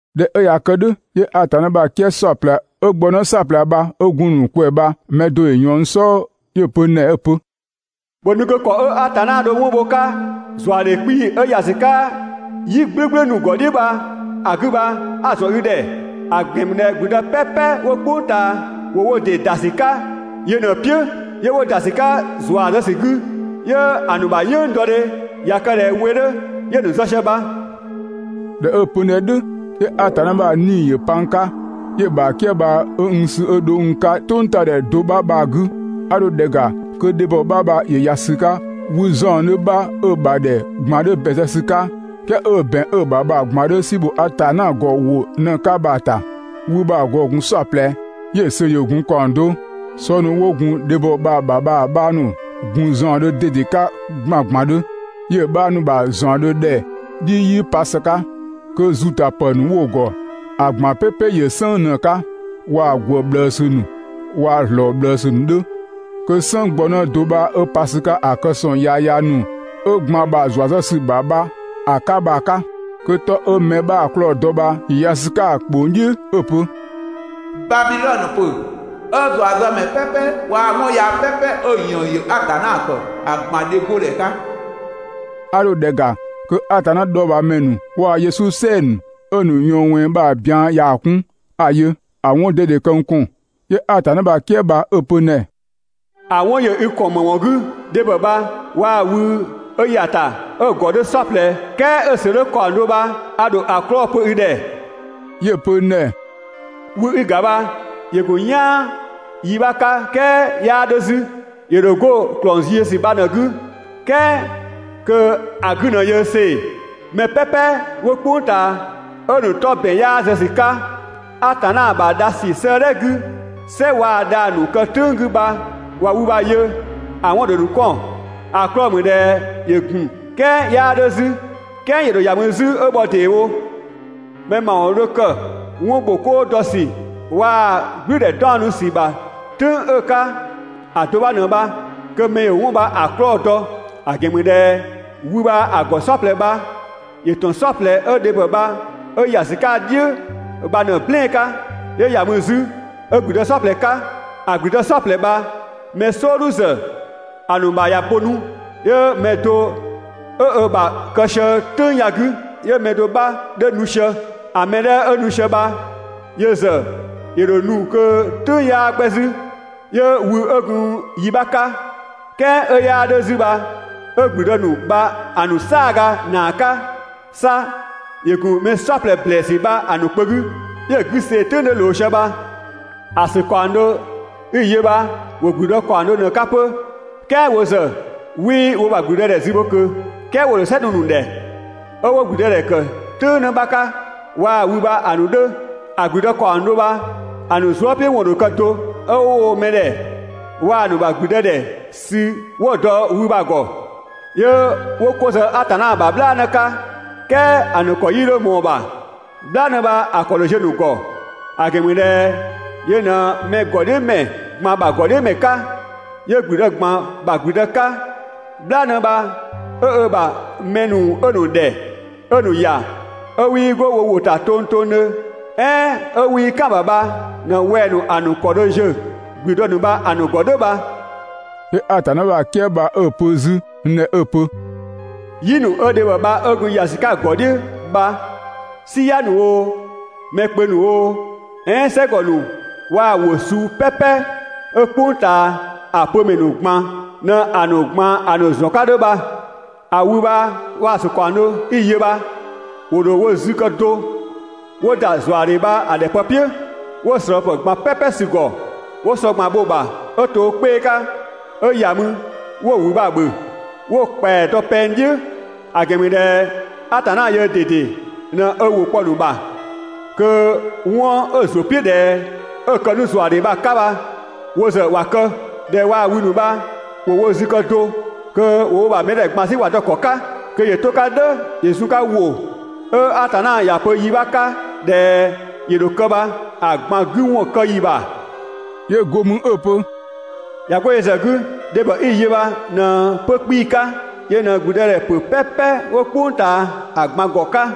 ꞊Dhɛ 'ö ꞊ya kë "dhʋ̈, 'yö Atanna ‑bha "kië "saɔplɛ 'ö gbɔnë "saɔplɛ bha 'ö gun‑ ‑nu ꞊kwɛɛ bha‑ mɛ do ‑yö ꞊yɔɔn n "sɔɔ 'yö‑ pö n ‑dhɛ 'ö‑ pö: «‑Bhö nu kö ‑kɔ 'ö Atanna dho 'wɔn bho‑ 'ka ‑zuadhe 'kpii‑ 'ö ‑ya ‑sü 'ka "yi "gblʋ̈gblʋ̈ ‑nu ‑gɔ "dhiʋ̈ bha‑ 'gü bha 'a‑ ‑zɔn i ‑dhɛ. ‑A ‑gɛn ‑mü ꞊dhɛ ‑gblüdë "pɛpɛ 'wo "kpʋng ꞊taa ‑wo wo ‑dɩ ‑da ‑sü 'ka yö ꞊në‑ "piʋ̈ 'yö 'wo ‑da ‑sü 'ka ‑zua zë ‑sü 'gü, 'yö‑ ‑nu ‑bha "yënng dɔ ꞊ya kë ꞊dhɛ we 'dhö 'yö‑ ‑nu zë sië bha.» ꞊Dhɛ 'ö‑ pö n ‑dhɛ "dhʋ̈, 'yö Atanna ‑bha 'Nii‑ ‑yö pa n 'ka, 'yö‑ ‑bha "kië bha 'ö n sü 'yö dho n 'ka "tʋngtadhɛ do 'bha bha‑ 'gü. A dho ‑dhɛ ‑ga kö dhebhɔ 'bha bha ‑yö ‑ya ‑sü 'ka wü ‑zaɔndhö 'bha 'ö‑ ‑bha ‑dhɛ ꞊gban 'dhö ‑bɛn zë ‑sü 'ka, "kɛɛ 'ö ‑bɛn 'ö‑ ‑bha bha‑ ꞊gban 'dhö "si ‑bho Atanna ‑gɔ ‑wʋ ꞊në‑ 'ka bha‑ ‑ta. Wü bha‑ ‑gɔ ‑gun "saɔplɛ, 'yö‑ ‑sö ‑yö gun ‑kaɔng do. Sɔ ‑nu 'wo gun dhebhɔ bha‑ ‑bha bha‑ 'bha ‑nu ‑gun ‑zaɔndhö ꞊dede 'ka ‑gbangbandhö, 'yö‑ 'bha ‑nu ‑bha ‑zaɔndhö ‑dhɛ "dhiʋ̈ 'yii pa ‑së 'ka, kö ‑zutapë ‑nu 'wo‑ ‑gɔ ‑a ꞊gban "pɛpɛ ‑yö "sënng ꞊në‑ 'ka, waa‑ ‑gwë ꞊bhlëësü ‑nu waa‑ ‑zlɔɔga ꞊bhlëësü ‑nu 'dhö. Kö "sënng gbɔnë do 'bha 'ö pa ‑sü 'ka ‑a kë ‑sɔng yaya ‑nu 'ö ‑gban ‑bha ‑zua zë ‑sü ‑bha bha‑ 'ka bha‑ 'ka. Kö 'tɔ 'ö mɛ 'bhaa‑ 'klɔɔ‑ dɔ bha ‑yö ‑ya ‑sü 'ka‑ ‑kpong "dhiʋ̈ 'ö‑ pö: «Babidhɔnö ‑pö 'ö ‑zuazëmɛ "pɛpɛ ꞊gban waa‑ 'wɔn yaa "pɛpɛ 'ö‑ ‑yënng ‑yö Atanna ‑kë ‑a ꞊gban dhe 'godhɛ 'ka.» 'A dho ‑dhɛ ‑ga kö Atanna dhɔɔbhaamɛ ‑nu waa‑ Yesu "sɛɛ‑ ‑nu 'ö‑ ‑nu ꞊yɔɔn ꞊wɛnng bha‑ bian yaa‑ 'kun, 'a‑ yö, ‑a 'wɔn ꞊dede kë n ‑kɔn. 'Yö Atanna ‑bha "kië bha 'ö‑ pö n ‑dhɛ: «‑A 'wɔn ‑yö i ‑kɔn ‑më ‑wɔn 'gü? Dhebhɔ bha waa‑ wü 'ö ‑ya ‑ta 'ö‑ ‑gɔ 'dhö "saɔplɛ "kɛɛ 'ö‑ ‑sö 'dhö ‑kaɔng do bha a ‑dho ‑a 'klɔɔ‑ pö i ‑dhɛ.» 'Yö‑ pö n ‑dhɛ: «Wü 'i‑ ‑ga bha ‑yö ‑gun "yaan yi 'bha 'ka "kɛɛ 'yaa 'dhö 'zü. ‑Yö ‑dho 'go ‑klɔng züziösü bha ꞊në‑ 'gü "kɛɛ kö‑ 'gü ꞊në ‑yö see‑. Mɛ "pɛpɛ 'wo "kpʋng ꞊taa 'ö‑ ‑nu 'tɔ ‑bɛn 'yaa zë ‑sü 'ka Atanna ‑bha dha ‑sü 'sëëdhɛ 'gü "sɛ waa‑ dhang‑ ‑nu kë "tʋ̈ng 'gü bha ꞊wa wü bha‑ yö, ‑a 'wɔn ‑dho ‑nu 'kɔn. ‑A 'klɔɔ‑ ‑mü ꞊dhɛ ‑yö ‑gun, "kɛɛ 'yaa 'dhö 'zü, "kɛɛ ‑yö ‑dho ‑ya mü 'zü 'ö bhɔ ‑deewo. Mɛ ‑mawɔn dho kë 'wɔn ‑bho 'koo dɔ ‑sü waa‑ "gblʋ̈ʋ̈dhɛ 'daɔnnu ‑sü ‑bha "tʋ̈ng 'ö‑ 'ka ‑a do 'bha ꞊në bha, kö mɛ ‑yö 'wɔn bha‑ 'klɔɔ‑ dɔ. ‑A ‑gɛn ‑mü ꞊dhɛ wü bha‑ ‑gɔ "saɔplɛ bha ‑yö ‑tɔn "saɔplɛ 'ö dhebhɔ bha 'ö ‑ya ‑sü 'ka‑ "dhiʋ̈ bha ꞊në‑ "blɛɛn‑ 'ka, 'yö ‑ya mü 'zü 'ö ‑gblüdë "saɔplɛ 'ka. ‑A ‑gblüdë "saɔplɛ bha‑ mɛ "sɔɔdhu ‑zë ‑a ‑nu ‑bha ꞊ya bo 'nu, 'yö‑ mɛ do 'ö ö ‑bha kë sië "tʋ̈ng ya‑ 'gü, 'yö‑ mɛ do 'bha 'dhö nu sië. ‑A mɛ 'dhɛ 'ö nu sië bha yö ‑zë ‑yö ‑dho nu kö "tʋ̈ng 'yaa 'gbɛ 'zü. 'Yö wü 'ö gun yi 'bha 'ka, "kɛɛ 'ö 'yaa 'dhö 'zü bha 'ö ‑gblüdë ‑nu bha‑ ‑nu "saaga ‑naa 'ka, 'sa ‑yö ‑gun mɛ "saɔplɛ ‑blɛɛsü bha‑ ‑nu kpö 'gü, 'yö‑ 'gü see‑ "tʋ̈ng 'dhö ꞊loo sië bha. ‑A ‑sö ‑kaɔng do 'i‑ yö bha ‑wo ‑gblüdë ‑kaɔng do ꞊në‑ 'ka 'pö, "kɛɛ wo ‑zë 'wii wo ‑bha ‑gblüdëdhɛ zü bho ꞊kö, "kɛɛ ‑wo ‑dho "sɛ nu‑ ‑nu ‑dhɛ 'ö wo ‑gblüdëdhɛ ‑kë "tʋ̈ng 'në 'bha 'ka waa‑ wü bha‑ ‑nu 'dhö. ‑A ‑gblüdë ‑nu ‑kaɔng do bha‑ ‑nu zuëpiʋ̈wɔn ‑dho kë do, 'ö 'wo woo‑ mɛ ‑dhɛ waa‑ ‑nu ‑bha 'gügbɩɩdhɛ sü 'wo‑ dɔ wü bha‑ ‑gɔ. 'Yö 'wo 'ko zë Atanna ‑bha "bhlaanë 'ka, "kɛɛ ‑a ‑nu ‑kɔ 'yii 'dho ꞊mɔɔ‑ ‑bha, "bhlaanë bha‑ ‑kɔ ‑dho ziö‑ ‑nu ‑gɔ, ‑a ‑gɛn ‑mü ꞊dhɛ yö ꞊në mɛ ‑gɔdhiʋ̈mɛ ꞊gban ‑bha ‑gɔdhiʋ̈mɛ 'ka, 'yö ‑gblüdë ꞊gban ‑bha ‑gblüdë 'ka. "Bhlaanë bha 'ö ö ‑bha mɛ ‑nu 'ö‑ ‑nu ‑dhɛ, 'ö‑ ‑nu ‑ya, 'ö 'wii 'go wo ‑wʋ ‑ta tongtongdhö, "ɛɛn 'ö 'wii "kan‑ ‑bha bha ꞊në wɛng‑ ‑nu ‑a ‑nu ‑kɔ dho ziö ‑gblüdë ‑nu bha‑ ‑nu ‑gɔ "dhʋ̈ bha.» 'Yö Atanna ‑bha "kië bha 'ö‑ pö 'zü n ‑dhɛ 'ö‑ pö: «"Yi ‑nu 'ö dhebhɔ bha 'ö gun ‑ya sië‑ ‑gɔ "dhiʋ̈ bha, "siya ‑nu oo, mɛ kpö ‑nu oo, "ɛɛn "sɛgɔ ‑nu waa‑ ‑wʋ suu "pɛpɛ 'ö "kpʋng ꞊taa ‑a pö ‑mɛ ‑nu ꞊gban ꞊në‑ ‑nu ‑zɔn 'ka 'dhö bha. ‑A wü bha waa‑ ‑sö ‑kaɔng do 'i‑ yö bha ‑wo ‑dho wo zü kë do 'wo ‑da ‑zuadhe bha‑ ‑dhɛ pë "piʋ̈, 'wo‑ ꞊slɔɔpë ꞊gban "pɛpɛ sü‑ ‑gɔ 'wo sɔ ꞊gban bho‑ ‑bha 'ö to ö 'kpee‑ 'ka, 'ö ‑ya mü 'wo‑ ‑wü 'bha ‑bhö, 'wo‑ ‑kpɛa dɔ pɛng "dhiʋ̈. ‑A ‑gɛn ‑mü ꞊dhɛ Atanna yöö ꞊dede ꞊në ö ‑wʋ kpɔ‑ ‑nu ‑bha kö 'wɔn 'ö‑ ‑zʋ "piʋ̈ ꞊dhɛ 'ö‑ kë 'nu ‑zuadhe bha‑ 'ka bha wo ‑zë ‑wa kë, ꞊dhɛ waa wü ‑nu bha ‑wo wo zü kë do, kö ‑wo wo ‑bha mɛdhɛ ꞊gban 'sü ‑wa dɔ‑ ‑kɔ 'ka kö ‑yö 'to‑ 'ka "dhʋ̈ ‑yö zun‑ 'ka ‑wʋ 'ö Atanna ‑ya pö yi 'bha 'ka ꞊dhɛ ‑yö ‑dho kë bha‑ ꞊gban 'gü ‑wɔn kë ‑yi ‑bha. 'Yö go mü 'ö‑ pö: «꞊Ya 'go yö ‑zë 'gü, dhebhɔ 'i‑ yö bha ꞊në 'pö 'kpii‑ 'ka, yö ꞊në ‑gblüdëdhɛpö "pɛpɛ 'wo "kpʋng ꞊taa ‑a ꞊gban ‑gɔ 'ka.»